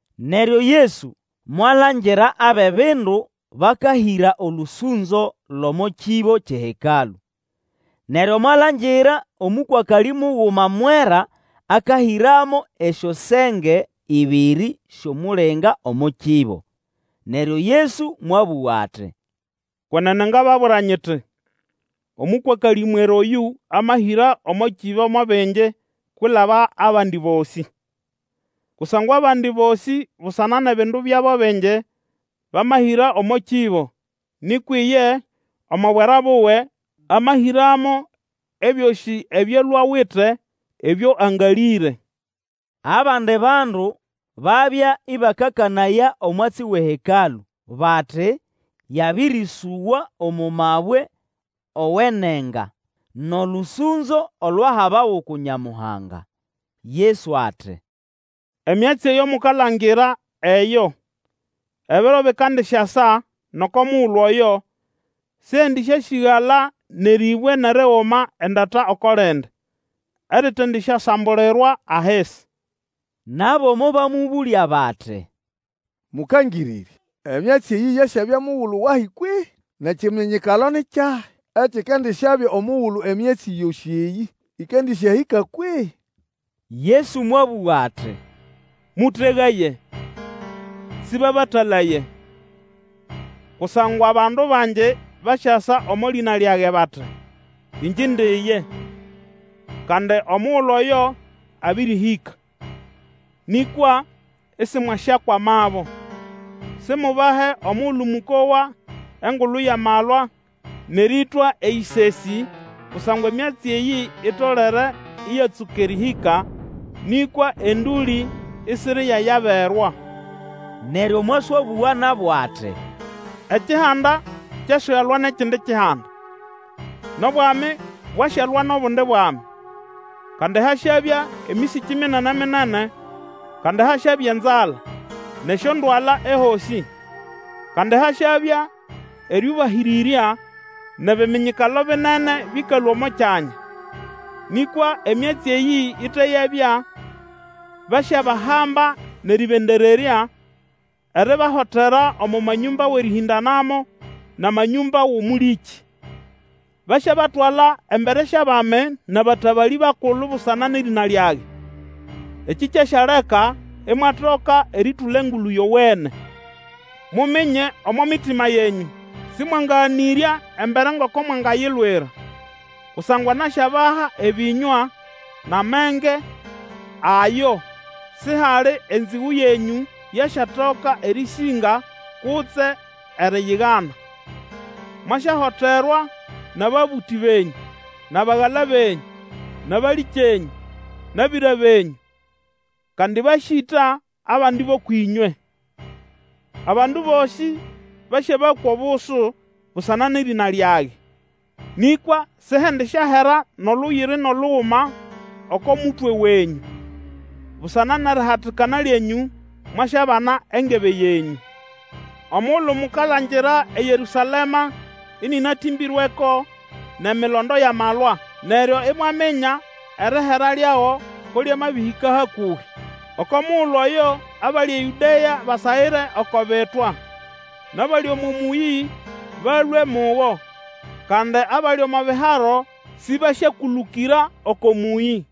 Neryo Yesu mwalangira abʼebindu bakahĩra olũsũnzo lʼomo kĩbo kyʼeHekalũ. Neryo mwalangira omũkwakalĩ muguma mwera akahĩramo esyosenge ĩbĩrĩ syʼomulinga omo kĩbo. Neryo Yesu mwabũga ati, Kwenene ngababwira nyiti omũkwakalĩ mwera oyũ amahĩra omo kĩbo mo bingi kwilaba abandi bosĩ. Kusangwa abandi bosĩ busana nʼebindu byabo bingi bamahĩra omo kĩbo; nĩkwa iye omo bwera buwe, amahĩramo ebyosĩ ebyo alwe awite ebyo angalĩre. Abandi bandu babya ĩbakakanaya omwatsi wʼeHekalũ, bati yabĩrĩsũgwa omo mabwe owenenga nʼolũsũnzo olwahabawa uku Nyamuhanga. Yesu ati, Emyatsi eyo mukalangira eyo, ebiro bikandisyasa nʼoko mugulu oyo, sihendĩsyasĩgala nʼerĩbwe nʼeriguma endata oko lindi eritendisyasambulirwa ahisi. Nabo mobamũbũlya bati, Mũkangĩrĩrya, emyatsi eyĩ yasyabya mugulu wahi kwehĩ? Nʼekiminyikalo ni kyahi ekikandisyabya omugulu emyatsi yosĩ eyĩ ĩkandĩsyahĩka kwehĩ? Yesu mwabũga ati, Mũtegaye, sĩbabatalaye! Kusangwa bandu bangi basyasa omo lĩna lyage bati, Ĩngye indi ye! Kandi omugulu oyo abĩrĩhĩka! Nĩkwa isimwasyakwamabo. Simubahe omugulu mũkowa engulu yʼamalwa nʼerĩtwa eyĩsesĩ, kusangwa emyatsi eyĩ itolere ĩyatsũka erĩhĩka, nĩkwa endũlĩ isiriyayaberwa. Neryo mwaswabũga nabo ati, Ekihanda kyasyalwa nʼekindi kihanda, nʼobwami bwasyalwa nʼobundi bwami. Kandi hasyabya emĩsĩkĩ minene-minene, kandi hasyabya enzala, nʼesyondwala ehosĩ. Kandi hasyabya erĩũbahĩrĩrya, nʼebiminyikalo binene bĩkalũa omo kyanya. Nĩkwa emyatsi eyĩ ite yabya, basyabahamba nʼerĩbendererya, eribahotera omo manyũmba wʼerĩhĩndanamo nʼamanyũmba wʼomũlĩkĩ. Basyabatwala embere syʼabami nʼabatabalĩ bakulu busana nʼerĩna lyage. Ekĩ kyasyaleka imwatoka erĩtũla Engulu Yowene. Muminye omo mitima yenyũ, sĩmwangaganĩrya embere ngoko mwangayilwira. Kusangwa nasyabaha ebĩnywa nʼamenge ayo sihali enzĩgũ yenyũ yasyatoka erĩsĩnga kutse eriyigana. Mwasyahoterwa nʼababũtĩ benyũ nʼabagala benyũ, nʼabalĩkyenyũ, nʼabĩra benyũ, kandi basyĩta abandi bʼũkwʼĩnywe. Abandu bosĩ basyabakwa obusu busana nʼerĩna lyage. Nĩkwa sihendisyahera nʼoluywiri nʼoluguma oko mutwe wenyũ. Busana nʼerihatikana lyenyũ mwasyabana engebe yenyũ. Omugulu mukalangira eYerũsalema ĩnĩnatĩmbĩrweko nʼemilondo yʼamalwa, neryo imwaminya erihera lyago ko lyamabĩhĩka hakũbĩ. Oko mugulu oyo abali eYũdea basagĩre oko bitwa; nʼabali omo mũyĩ balũe mugo, kandi abali omo biharo sibasyekũlũkĩra oko mũyĩ.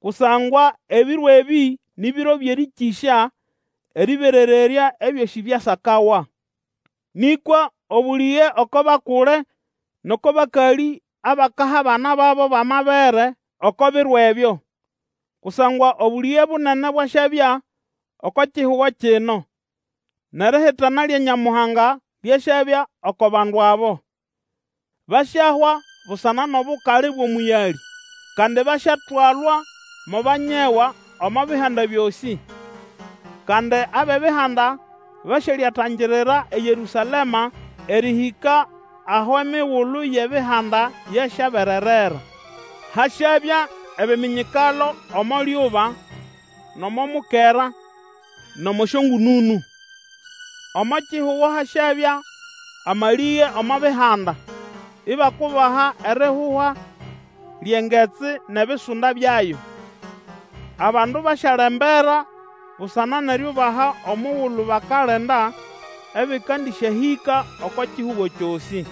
Kusangwa ebiro ebĩ ni biro byʼerĩkĩsya, erĩberererya ebyosĩ byasakawa. Nĩkwa obũlĩge oko bakule nʼoko bakalĩ abakaha abana babo bʼamabere oko biro ebyo! Kusangwa obũlĩge bunene bwasyabya oko kihugo kino, nʼerihitana lya Nyamuhanga lyasyabya oko bandu abo. Basyahwa busana nʼobukali bwʼomũyalĩ, kandi basyatwalwa mo banyegwa omo bihanda byosĩ. Kandi abʼEbihanda basyalyatangirira eYerũsalema erĩhĩka aho emigulu yʼEbihanda yasyabererera. Hasyabya ebiminyikalo omo lyuba, nʼomo mukera, nʼomo syongũnũnũ. Omo kihugo hasyabya amalĩge omo bihanda, ibakubaha erihuha lyʼengetsi nʼebisunda byayo. Abandu basyalembera busana nʼeriubaha omugulu bakalinda, ebĩkandĩsyahĩka oko kihugo kyosĩ.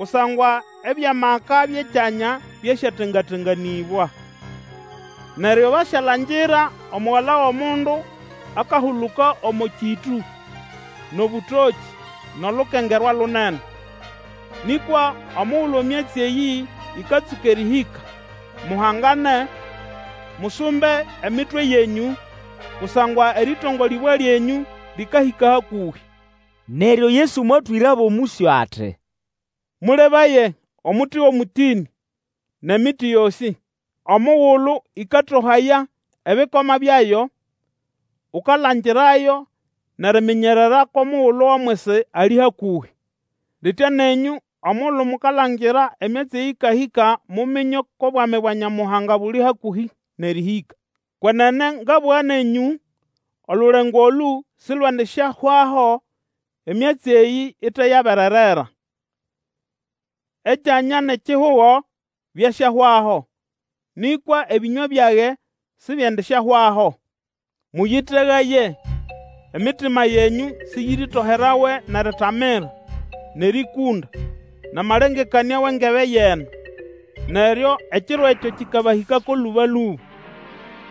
Kusangwa ebyʼamaka byʼekyanya byasyatenga-tenganĩbwa. Neryo basyalangira Omugala wʼOmundu akahuluka omo kĩtũ, nʼobũtokĩ, nʼolukengerwa lunene. Nĩkwa omugulu emyatsi eyĩ ĩkatsũka erĩhĩka, muhangane, musumbe emitwe yenyũ, kusangwa erĩtongolĩbwa lyenyũ lĩkahĩka hakũhĩ. Neryo Yesu mwatwĩrabo mũsyo ati, Mũlebaye omuti wʼomũtĩnĩ, nʼemiti yosĩ. Omugulu ĩkatohaya ebĩkoma byayo, ukalangirayo nʼeriminyerera kʼomugulu wʼomwisi ali hakũhĩ. Litya nenyũ, omugulu mukalangira emyatsi eyĩ ĩkahĩka muminye kʼobwami bwa Nyamuhanga buli hakũhĩ nʼerĩhĩka. Kwenene ngabũga nenyũ, olulengo olũ silwendisyahwaho, emyatsi eyĩ ite yabererera. Ekyanya nʼekihugo byasyahwaho, nĩkwa ebĩnywa byage sibyendisyahwaho. Mũyĩtegaye, emitima yenyũ sĩyĩrĩtoherawe nʼeritamira, nʼerĩkũnda, nʼamalengekanĩa wʼengebe yʼeno, neryo ekiro ekyo kĩkabahĩkako lũba-lũba!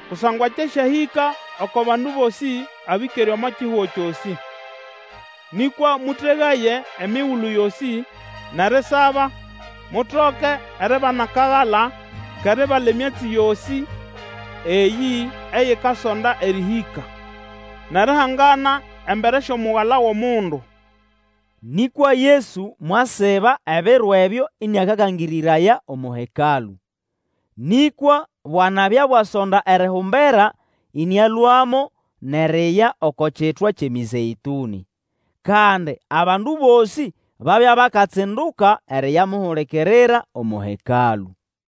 Kusangwa kyasyahĩka oko bandu bosĩ abĩkere omo kihugo kyosĩ. Nĩkwa mũtegaye emigulu yosĩ, nʼerisaba, mutoke eribana akagala kʼeribala emyatsi yosĩ eyĩ eyikasonda erĩhĩka, nʼerihangana embere syʼOmugala wʼOmundu. Nĩkwa Yesu mwasiba ebiro ebyo ĩnĩakakangĩrĩraya omo Hekalũ. Nĩkwa bwanabya bwasonda erihumbera, ĩnĩalũamo nʼeriya oko Kitwa kyʼeMĩzeĩtũnĩ. Kandi abandu bosĩ babya bakatsinduka eriyamuhulikirira omo Hekalũ.